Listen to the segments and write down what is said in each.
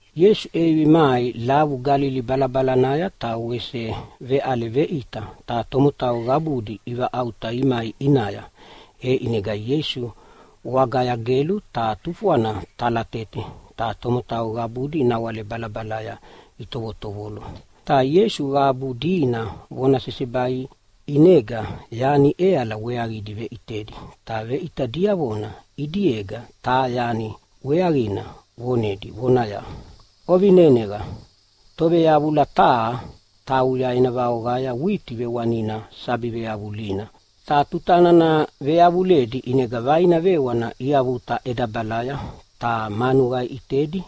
Ieisu ʼevivi mai lavu Galili balabalanaya ta wese veʼale veʼita. Ta tomotau qabudi ivaʼauta imai ʼinaya, e ʼinega Ieisu wagaya gelu ta tufwana talatete, ta tomotau qabudi nawale balabalaya itovotovolo. Ta Ieisu qabu dina vona sesebai ʼinega yani ʼeala weaqidi veʼitedi, ta veʼita diavona ʼidiega taha yani weaqina vonedi vonaya, “Ovineneqa! Toveyavula taha tauya ena vaoqaya witi vewanina sabi veyavulina. Ta tuta nana veyavuledi ʼinega vaina vewana iavuta ʼedabalaya, ta manuqa iʼitedi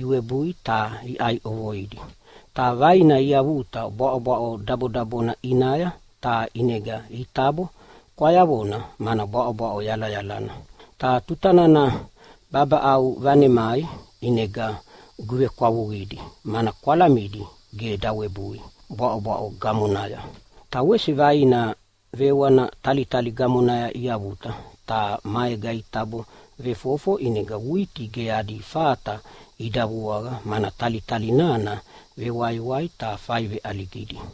iwebui ta iʼai ʼovoidi. Ta vaina iavuta bwaʼo dabodabona ʼinaya, ta ʼinega itabo kwayavona mana bwaʼobwaʼo yalayalana. Ta tuta nana babaʼau vanemai ʼinega guvekwavuqidi, mana kwalamidi ge ida webui bwaʼobwaʼo gamonaya. Ta wese vaina vewana talitali gamonaya iavuta ta maega itabo vefofo, ʼinega witi ge adi fata ida vuaqa, mana talitali nana vewaiwai ta fai veʼaligidi.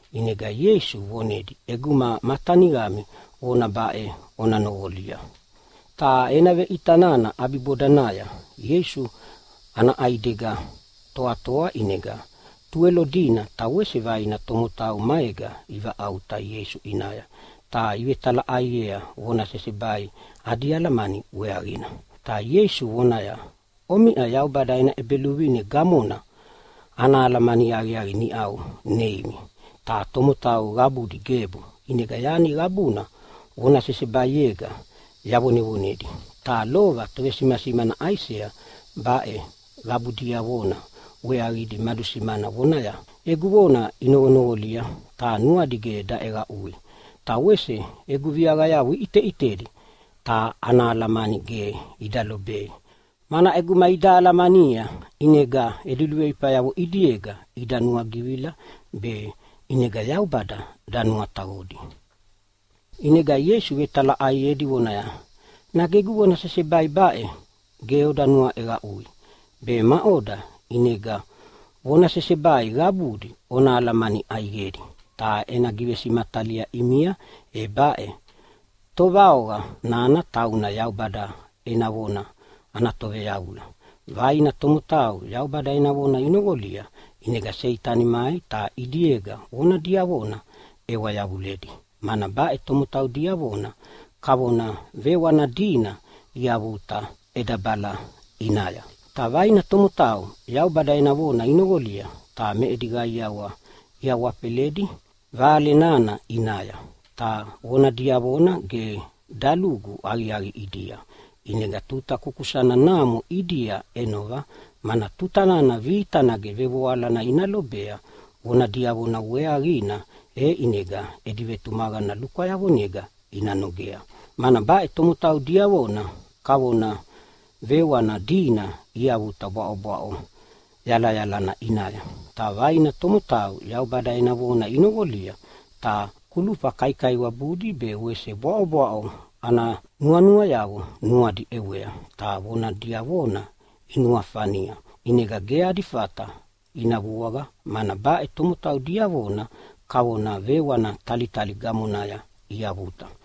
ʼInega Ieisu vonedi, “ʼEguma ma teniqami vona baʼe ona noqolia.” Ta ena veʼita nana ʼabibodanaya Ieisu ana ʼaidega toatoa, ʼinega Tuwelo dina ta wese vaina tomotau maega ivaʼauta Ieisu ʼinaya ta ivetalaʼaiea vona sesebai adi alamani weaqina. Ta Ieisu vonaya, “Omiʼa Yaubada ena ʼEbeluvine gamona ana alamani aqiaqi niʼau neimi. Ta tomotau qabudi gebu, ʼinega yani qabuna vona sesebaiega yavonevonedi, ta lova tovesimasimana Aisea baʼe qabu diavona weaqidi madusimana vonaya, ‘Egu vona inoqonoqolia ta nuadi ge daʼeqaʼui, ta wese egu viaqayavo iʼiteʼitedi ta ana alamani ge ida lobei. Mana ʼeguma ida alamania ʼinega edi luveifayavo ʼidiega ida nuagivila be ʼinega Yaubada danuataqodi.’” ʼInega Ieisu vetalaʼaiedi vonaya, “Nage egu vona sesebai baʼe ge oda nuaʼeqaʼui? Be maʼoda ʼinega vona sesebai gabudi ona alamani ʼaiqedi? Ta ena givesimatalia ʼimia, e baʼe: Tovaoqa nana tauna Yaubada ena vona ana toveyavula. Vaina tomotau Yaubada ena vona inoqolia, ʼinega Seitani mai ta ʼidiega vona diavona ʼewa yavuledi, mana baʼe tomotau diavona kavona vewani dina iavuta ʼedabala ʼinaya. Ta vaina tomotau Yaubada ena vona inoqolia, ta me edi qaiawa iawafeledi Vale nana ʼinaya. Ta vona diavona ge dalugu aqiaqi ʼidia, ʼinega tuta kukusana namo ʼidia ʼenova, mana tuta nana vita nage vevoalana ina lobea vona diavona weaqina, e ʼinega edi vetumaqana lukwayavonega ina nogea, mana baʼe tomotau diavona kavona vewani dina iavuta bwaʼobwaʼo yalayalana ʼinaya. Ta vaina tomotau Yaubada ena vona inoqolia, ta kulufa kaikaiwabudi be wese bwaʼobwaʼo ana nuanuayavo nuadi ʼewea ta vona diavona inuafania ʼinega ge adi fata ina vuaqa, mana baʼe tomotau diavona kavona vewana talitali gamonaya iavuta.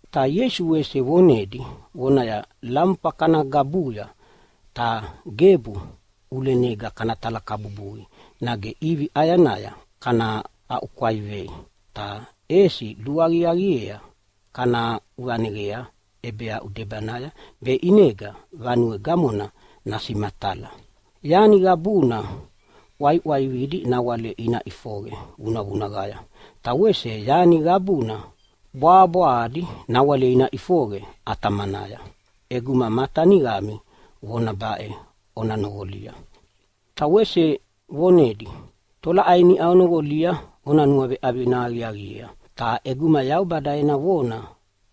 Ta Ieisu wese vonedi vonaya, “Lamufa kana gabuya, ta gebu ʼulenega kana talakabubui nage ʼivi ʼayanaya kana aʼukwaivei. Ta ʼesi luaqiaqiea kana aʼuvaneqea ʼebeaʼu debanaya be ʼinega vanue gamona nasimatala. Yani qabuna ʼwaiʼwaividi nawale ina ʼifoqe vunavunaqaya. Ta wese yani qabuna bwabwahadi nawale ina ʼifoqe ʼatamanaya. ʼEguma ma teniqami vona baʼe ona noqolia!” Ta wese vonedia, “Tolaʼai niʼa onoqolia ona nuaveʼavina aqiaqiea. Ta ʼeguma Yaubada ena vona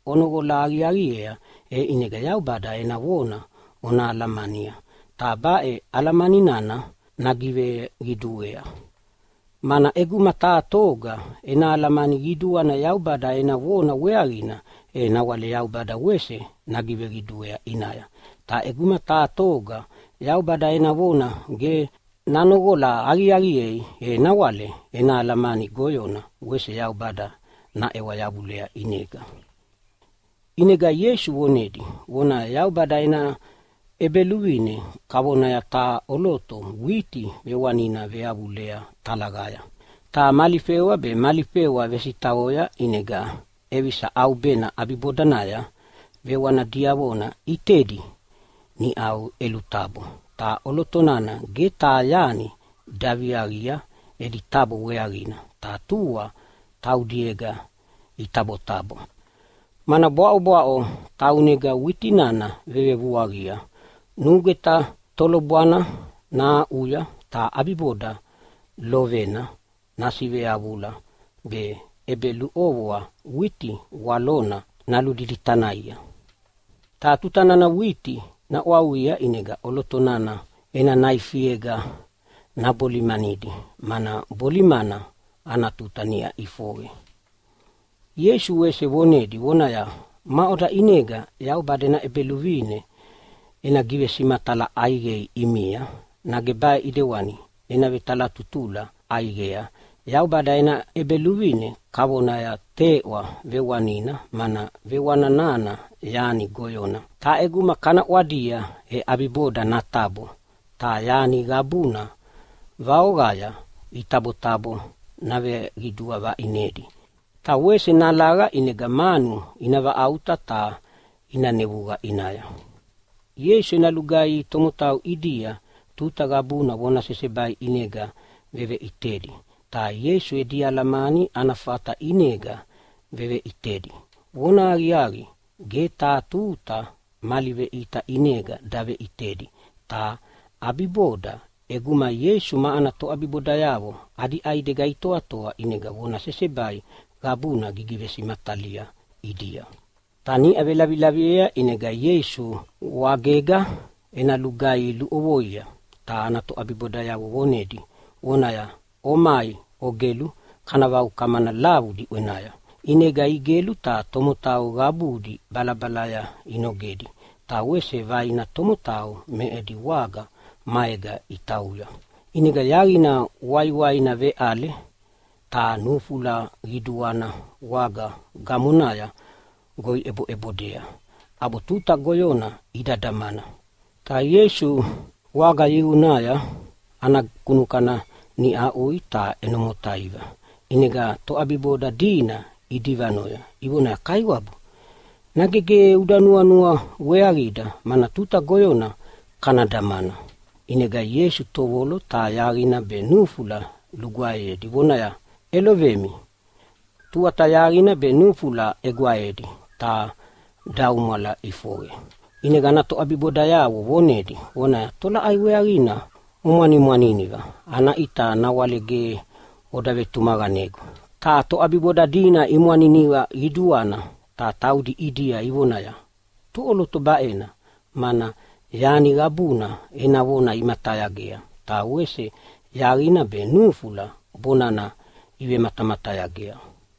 ona noqola aqiaqiea, e ʼinega Yaubada ena vona ona alamania, ta baʼe alamani nana nagiveqiduea. Mana ʼeguma taha toga ena alamani qiduana Yaubada ena vona weaqina, e nawale Yaubada wese nagiveqiduea ʼinaya. Ta ʼeguma taha toga Yaubada ena vona ge nanoqola aqiaqiea, e nawale ena alamani goyona wese Yaubada naʼewa yavulea ʼinega.” ʼInega Ieisu vonedi vonaya, “Yaubada ena ʼEbeluvine kavonaya taha ʼoloto witi vewanina veyavuledi talaqaya. Ta mali fewa be mali fewa vesitaqoya ʼinega ʼevisa ʼaubena ʼabibodanaya vewana diavona ʼitedi niʼa iʼelutabo, ta ʼoloto nana ge taha yani daviaqia edi tabo weaqina, ta tua taudiega itabotabo, mana bwaʼobwaʼo taunega witi nana vevevuaqia. Nugweta tolobwana nahaʼuya, ta ʼabiboda lovena nasiveyavula, be ʼebeluʼovoa witi walona naludiditanaha. Ta tuta nana witi naʼwauqia ʼinega ʼoloto nana ena naifiega nabolimanidi, mana bolimana ana tuta niʼa ʼifoqe.” Ieisu wese vonedi vonaya, “Maʼoda ʼinega Yaubada ena ʼEbeluvine ena givesimatala ʼaiqei ʼimia? Nage baʼe ʼidewana ena vetalatutula ʼaiqea: Yaubada ena ʼEbeluvine kavona teʼwa vewanina, mana vewani nana yani goyona. Ta ʼeguma kana ʼwadia e ʼabiboda natabo ta yani qabuna vaoqaya itabotabo naveqidua vaʼinedi. Ta wese nalaqa, ʼinega manu ina vaʼauta ta ina nevuqa ʼinaya.” Ieisu ena lugaihi tomotau ʼidia tuta qabuna vona sesebai ʼinega veveʼitedi. Ta Ieisu edi alamani ana fata ʼinega veveʼitedi. Vonahaqiaqi, ge taha tuta mali veʼita ʼinega daveʼitedi. Ta ʼabiboda ʼeguma Ieisu ma ana toʼabibodayavo adi ʼaidega itoatoa ʼinega vona sesebai qabuna gigivesimatalia ʼidia. Ta niʼa velavilaviea ʼinega Ieisu wagega ena lugaihi luʼovoia, ta ana toʼabibodayavo vonedi vonaya, “Omai ogelu, kana vaukamana lavu diʼwenaya.” ʼInega igelu ta tomotau qabudi balabalaya inogedi, ta wese vaina tomotau me edi waga maega itauya. ʼInega yaqina waiwaina veʼale, ta nufula qiduana waga gamonaya goi ʼeboʼebodea, ʼabo tuta goyona ida damana. Ta Ieisu waga yiqunaya ana kunukana niʼa aʼui ta ʼeno motaiva. ʼInega toʼabiboda dina idivanoya ivoneaya, “Kaiwabu, nage ge uda nuanua weaqida, mana tuta goyona kana damana!” ʼInega Ieisu tovolo ta yaqina be nufula lugwaeyedi vonaya, “ʼElovemi!” Tuata yaqina be nufula ʼegwaedi ta daumwala ʼifoqe. ʼInega ana toʼabibodayavo vonedi vonaya, “Tolaʼai weaqina omwanimwaniniva? Ana ʼita nawale ge oda vetumaqanegu?” Ta toʼabiboda dina imwaniniva qiduana ta taudi ʼidia ivonaya, “Toʼoloto baʼena, mana yani qabuna ena vona imatayagea, ta wese yaqina be nufula bonana ivematamatayagea?”